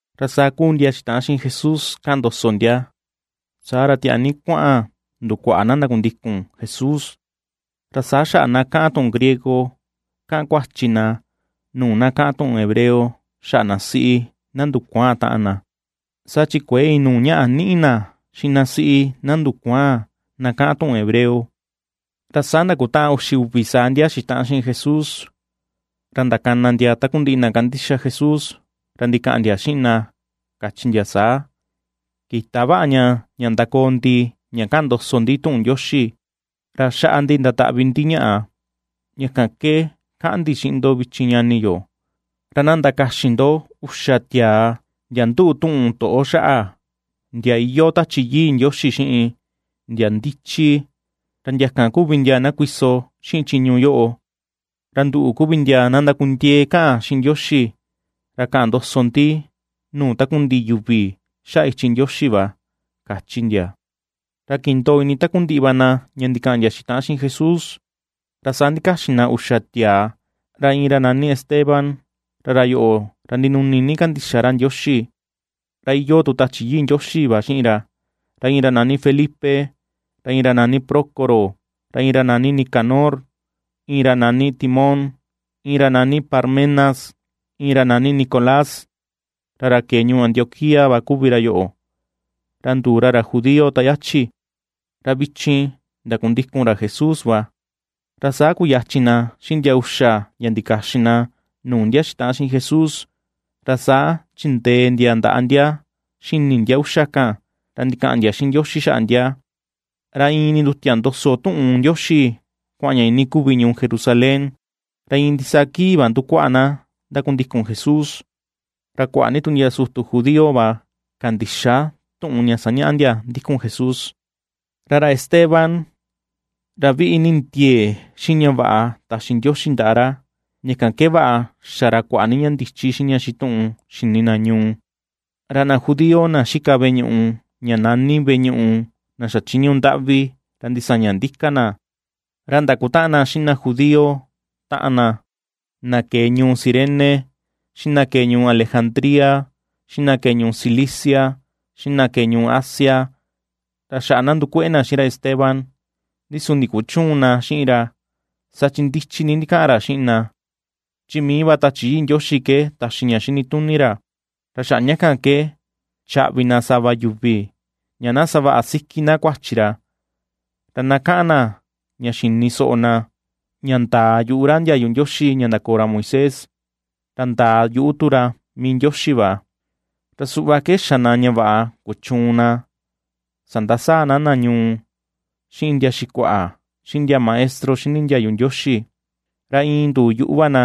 Ra saa ^kuu ndia xitaꞌan xiꞌin Jesús kaꞌan ndoso ndia, saa ra tiaa ni kuaꞌan ndukuaꞌa na ndakundikun Jesús, ra saa xaꞌa na kaꞌan tuꞌun griego kaꞌan kuachi na nuu na kaꞌan tuꞌun hebreo xaꞌa na siꞌi, na ndukuaan taꞌan na, saa chi kuëe inuu ñaꞌa niꞌi na xiꞌin na siꞌi, na ndukuaan na kaꞌan tuꞌun hebreo. Ra saa ndakutaꞌan uxi uvi saa ndia xitaꞌan xiꞌin Jesús, ra ndakana ndia takundiꞌi na kandixa Jesús, ra ndikaꞌan ndia xiꞌin na kachi ndia saa: ―Kïta vaꞌa ña, ña ndakoo ndi ña kaꞌan ndoso ndi tuꞌun Ndioxi, ra xaꞌa ndi ndataꞌvi ndi ñaꞌa. Ña kan ke kaꞌan ndi xiꞌin ndo vichin ñani yo, ra na ndakaxin ndo uxa tiaa, ndia nduꞌu tuꞌun toꞌo xaꞌa, ndia iyoo Tachi Yii Ndioxi xiꞌin, ndia ndichi, ra ndia kan kuvi ndia na kuiso xiꞌin chiñu yoꞌo. Ra nduꞌu kuvi ndia na ndakundiee kaꞌan xiꞌin Ndioxi, ra kaꞌan ndoso tu ndi nuu takundiꞌi yuvi xaꞌa ichi Ndioxi va ―kachi ndia. Ra kindoo ini takundiꞌi va na ña ndikaꞌan ndia xitaꞌan xiꞌin Jesús, ra saa ndikaxin na uxa tiaa, ra iin ra nani Esteban ra ra yoꞌo ra ndinuni ni kandixa ra Ndioxi, ra iyoo tu Tachi Yii Ndioxi va xiꞌin ra, iin ra nani Felipe, iin ra nani Prócoro, iin ra nani Nicanor, iin ra nani Timón, iin ra nani Parmenas, iin ra nani Nicolás, ra ra kee ñuu Antioquía va kuvi ra yoꞌo, ra nduu ra ra judío ta yachi, ra vichin ndakundikun ra Jesús va. Ra saa kuyachin na xiꞌin ndia uxa ndia ndikaxin na nuu ndia xitaꞌan xiꞌin Jesús, ra saa chindee ndia ndaꞌa ndia xini ndia uxa kan, ra ndikaꞌan ndia xiꞌin Ndioxi xaꞌa ndia. Ra iin nindutia ndoso tuꞌun Ndioxi kuaꞌan ña ini kuvi ñuu Jerusalén, ra iin ndisaa kii va ndukuaꞌa na ndakundikun Jesús, ra kuaꞌa ni tu ndia sutu judío va kandixa tuꞌun ña sañaꞌa ndia ndikun Jesús. Ra ra Esteban, ra viꞌi ni ndiee xiꞌin ña vaꞌa taxi Ndioxi ndaꞌa ra, ña kan ke vaꞌa xa ra kuaꞌa ni ña ndichi xiꞌin ña xituꞌun xini na ñuu. Ra na judío na xika veꞌe ñuꞌu ña nani veꞌe ñuꞌu na xachiñu ndaꞌvi ra ndisaña ndika na; ra ndakutaꞌan xiꞌin na judío taꞌan na, na kee ñuu Cirene, xiꞌin na kee ñuu Alejandría, xiꞌin na kee ñuu Cilicia, xiꞌin na kee ñuu Asia, ra xaꞌa na ^ndukueꞌe na xiꞌin ra Esteban. Ndi su ndikuchüun na xiꞌin ra, saa chi ndichi ni ndikaꞌan ra xiꞌin na, chi mii va Tachi Yii Ndioxi ke taxi ña xini tuni ra. Ra xaꞌa ña kan ke chaꞌvi na sava yuvi, ña na savaꞌa siki na kuachi ra, ra na kaꞌan na ña xini soꞌo na, ña ndaa yuꞌu ra ndiayu Ndioxi ña ndakoo ra Moisés, ra ndaa yuꞌu tu ra mii Ndioxi va. Ra suꞌva ke xa na ña vaꞌa kuchuun na sandasaa na na ñuu, xiꞌin ndia xikuaꞌa, xiꞌin ndia maestro xini ndiayu Ndioxi; ra iin nduu yuꞌu va na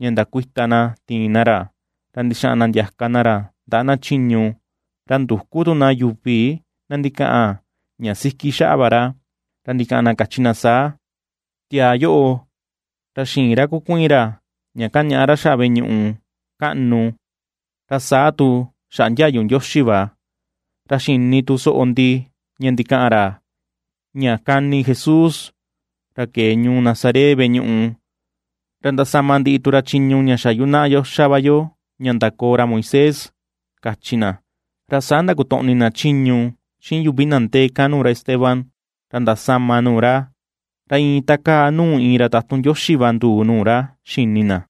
ña ndakuita na tiin na ra, ra ndixaꞌan na ndiaka na ra ndaꞌa na chiñu. Ra nduku tu na yuvi na ndikaꞌan ña siki xaꞌa va ra, ra ndikaꞌan na kachi saa: ―Tiaa yoꞌo, ra xïin ra kukuiin ra ña kañaꞌa ra xaꞌa veꞌe ñuꞌu kaꞌnu ra saa tu xaꞌa ndiayu Ndioxi va. Ra xini tu soꞌo ndi ña ndikaꞌan ra, ña kani Jesús, ra kee ñuu Nazaret, veꞌe ñuꞌu, ra ndasama ndiꞌi tu ra chiñu ña xa yunaꞌa yo xa va yo ña ndakoo ra Moisés ―kachi na. Ra saa ndakotoꞌni na chiñu, xiꞌin yuvi na ndee kan nuu ra Esteban, ra ndasama nuu ra, ra iin takaa nuu iin ra tatun Ndioxi va nduu nuu ra xini na.